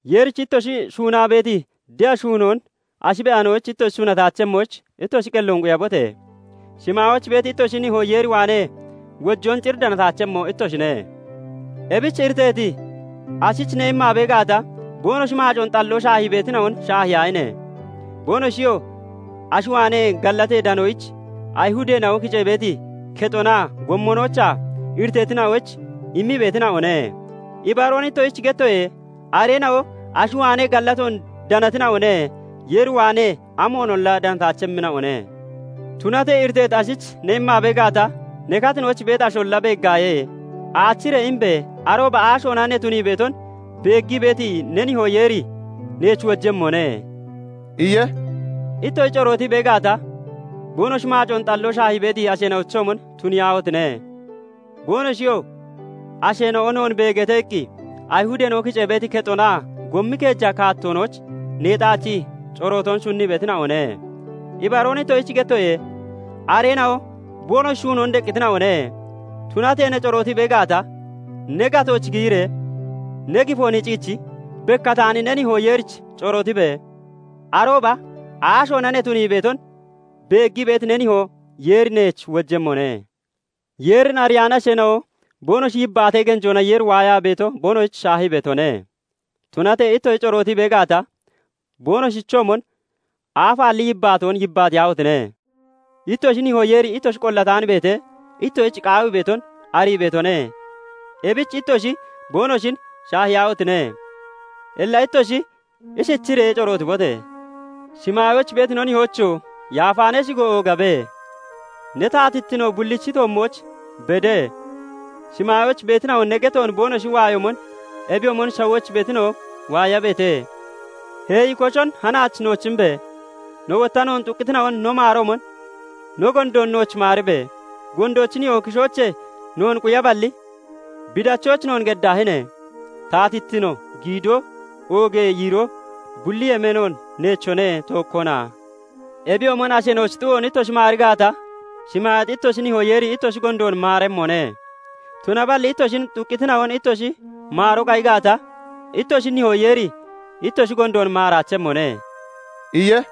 "Yeerich ittoshi shuunaa beeti de'a shuunoon ashi be'anoyich ittoshi shuunataachemmoyich, ittoshi qelloon quyabote! Shimaayooch beeti ittoshi nihoo Yeer waanee wojoon cir danataachemmo ittoshine. " 'Ebich iriteeti ashich ne immaa bee gaata, boonoshi maacoon xalloo shaahii beetina'on shaahiyaahine! Boonoshiyoo ashi waanee gallatee danoyich Ayihudeena'o kicee beeti kexonaa gommonoochaa iriteetina'oyich immii beetina'one. Ibaroon ittoshich gettoye; areena'o ashi waanee gallatoon danatina'one; Yeer waanee amoonolla danataachemmina'one. Tunatee iriteeti ashich ne immaa bee gaata, ne katinooch beeti asholla beeggaaye. Aachiree imebe! Arooba aashoona ne tunii beeton beeggii beeti ne nihoo Yeeri neech wojemmone" iye. "Ittoshi corootii bee gaata, boonoshi maacoon xalloo shaahii beeti asheena'ochoomon tuniyaahotine! Boonoshiyoo 'Asheena'o noon beegeete' iqqi Ayihudeena'o kicee beeti kexonaa gommi keeja kaattoonooch neexaachii corootoon shunnii beetina'one. Ibaroon ittoshich gettoye; areena'o boonoshi shuunoon deqqitina'one. Tunatee ne corootii bee gaata, ne gatooch giyiree ne gifoon hiciichi bekkataani ne nihoo Yeerich corootibe! Arooba aashoona ne tunii beeton beeggii beeti ne nihoo Yeeri neech wojemmone. "Yeerin ariyaani asheena'o boonoshi yibbaatee genjoona Yeeri waayaa beeto boonoshich shaahii beetone. Tunatee ittoshi corootii bee gaata, boonoshichoomon aafaalli yibbaatoon yibbaatiyaahotine! Ittoshi nihoo Yeeri ittoshi qollataan beetee, ittoshich qaawii beeton arii beetone; ebich ittoshi boonoshin shaahiyaahotine! "Illa ittoshi ishichiree corootibote! 'Shimaayooch beeti no Nihoocho! Yaafa ne shigo oogabe; Ne taatittino bullichi toommooch bede; shimaayooch beetina'o ne getoon boonoshi waayoomon, ebiyoomon shawooch beetina'o waayabeete; Heeyi koshon hanaach nooch imbe! No wotta noon xuqqitina'on no maaroomon, no gondoon nooch maaribe! Gondoochi nihoo kishoochee noon quyaballi, bi dachooch noon geddaahine! [Taatittino, giidoo, oogee yiiroo bulli yemeenoon neechone; tookkona.] "Ebiyoomon asheena'ochi xu'oon ittoshi maari gaata, shimaayeexi ittoshi nihoo Yeeri ittoshi gondoon maaremmone; Tunaballi ittoshin xuqqitina'on ittoshi maaroo qayi gaata, ittoshi nihoo Yeeri ittoshi gondoon maaraachemmone" iye.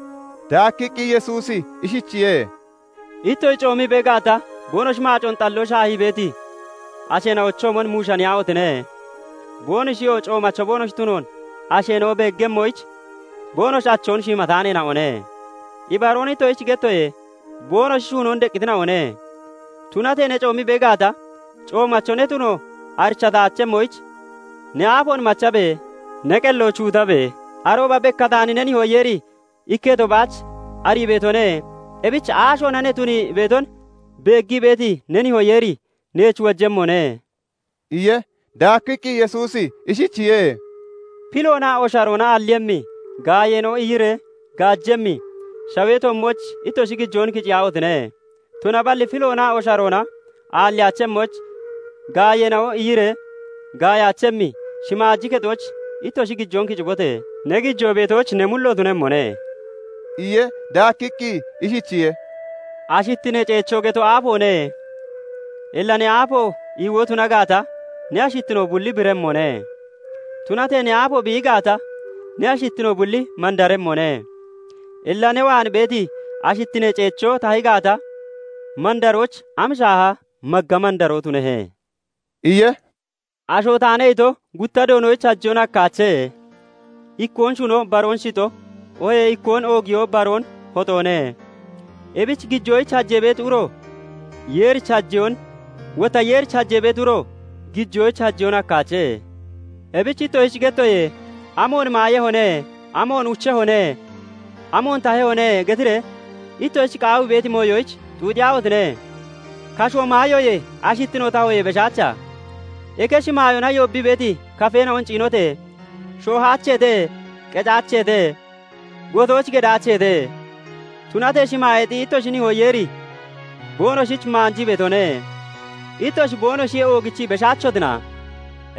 Daakkiqqi Yesuusi ishichiye:- "Ittoshi coomii bee gaata, boonoshi maacoon xalloo shaahii beeti asheena'ochoomon muushaniyaahotine! Boonoshiyoo coomacho boonoshi tunoon asheena'o beeggemmoyich boonoshi achoon shiimataaneena'one. Ibaroon ittoshich gettoye; boonoshi shuunoon deqqitina'one. "Tunatee ne coomii bee gaata, coomacho ne tuno arichataachemmoyich ne aafoon machabe! Ne qellooch huutabe! Arooba bekkataani ne nihoo Yeeri ikketo baach arii beetone; ebichi aashoona ne tunii beeton beeggii beeti ne nihoo Yeeri neech wojemmone" iye. Daakkiqqi Yesuusi ishichiye:- "Piloonaa osharoona aalliiyemmi, gaayeena'o iiyiree gaajemmi shawee toommooch ittoshi gijoon kiciyaahotine! Tunaballi piloonaa osharoona aalliyaachemmooch, gaayeena'o iiyiree gaayaachemmi shimaaji kexooch ittoshi gijoon kicibote! Ne gijoo beetooch ne mullo tunemmone" iye. Daakkiqqi ishichiye:- "Ashittinee ceechoo geto aafoone. Illa ne aafo iiwoo tuna gaata, ne ashittino bulli biremmone. Tunatee ne aafo biiyi gaata, ne ashittino bulli mandaremmone. Illa ne waan beeti ashittinee ceechoo tahi gaata, mandarochi am shaaha magga mandaroo tunehe?" iye. " 'Asho taane' ito gutta Doonoyich hajeyoon hakkaache. Ikkoon shuno baroon shixo, oohee ikkoon oogiyoo baroon hoxoone. Ebich gijoyich hajee beeti uro Yeerich hajeyoon, wotta Yeerich hajee beeti uro gijoyich hajeyoon hakkaache. "Ebich ittoshich gettoye; 'Amoon maayehone? Amoon ucehone? Amoon tahehone?' getiree ittoshich qaawii beeti mooyoyich xuuxiyaahotine! Kasho maayoye, ashittinoo tahoyee beshaacha? Eke shimaayoona yoobbii beeti kafeena'on ciinote! Shoohaacheete; qecaacheete; gotooch gedaacheete. Tunatee shimaayeexi ittoshi nihoo Yeeri boonoshich maanjii beetone. Ittoshi boonoshiyee oogichii beshaachotina?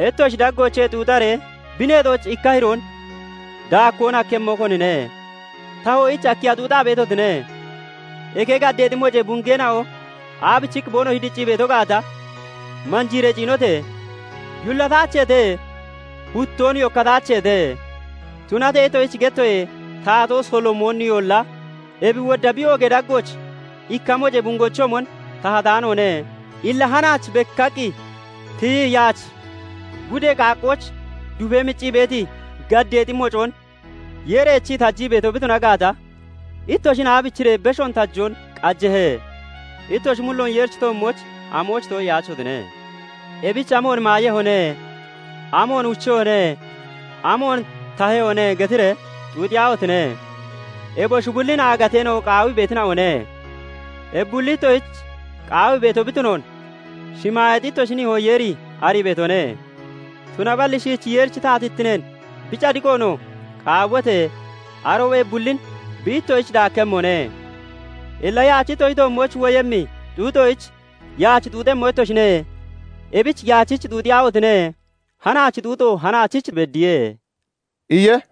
Ittoshi daggoochee xuuxaree bi neexooch ikka hiroon daakkoon hakkemmo konine? "Tahoyich akkiya xuuxaa beetotine? Eke gaddeexi mocee bungeena'o aabichiqqi boonoshi diccii beeto gaata, manjiiree ciinote! Yullataacheete; huttoon yokkataacheete. Tunatee ittoshich gettoye; Taatoo Solomooniyolla ebi wodda bi oogee daggooch ikka mocee bungechoomon tahataanoone. Illa hanaach bekkaqqi tiyi yaach gudee qaaggooch dufee mccii beeti gaddeexi mocoon Yeeri eechii tajii beeto bi tuna gaata, ittoshin aabichiree beshoon tajoo qajehe? Ittoshi mulloon Yeerichi toommooch amoyich too'iyaachotine? Ebich 'Amoon maayehone? Amoon ucehone? Amoon tahehone?' getiree xuuxiyaahotine! Eboshi bullin aagateena'o qaawii beetina'one. Ebi bulli ittoshich qaawii beeto bi tunoon shimaayeexi ittoshi nihoo Yeeri arii beetone. Tunaballi shiichi Yeerichi taatittineen, bi cadiqoonoo qaawibote! Arooba ebi bullin bi ittoshich daakkemmone. Illa, yaach ittoshi toommooch woyemmi xuuxoyich yaach xuuxemmo ittoshine; ebich yaachich xuuxiyaahotine! Hanaachi xuuxo hanaachich beddiye" iye.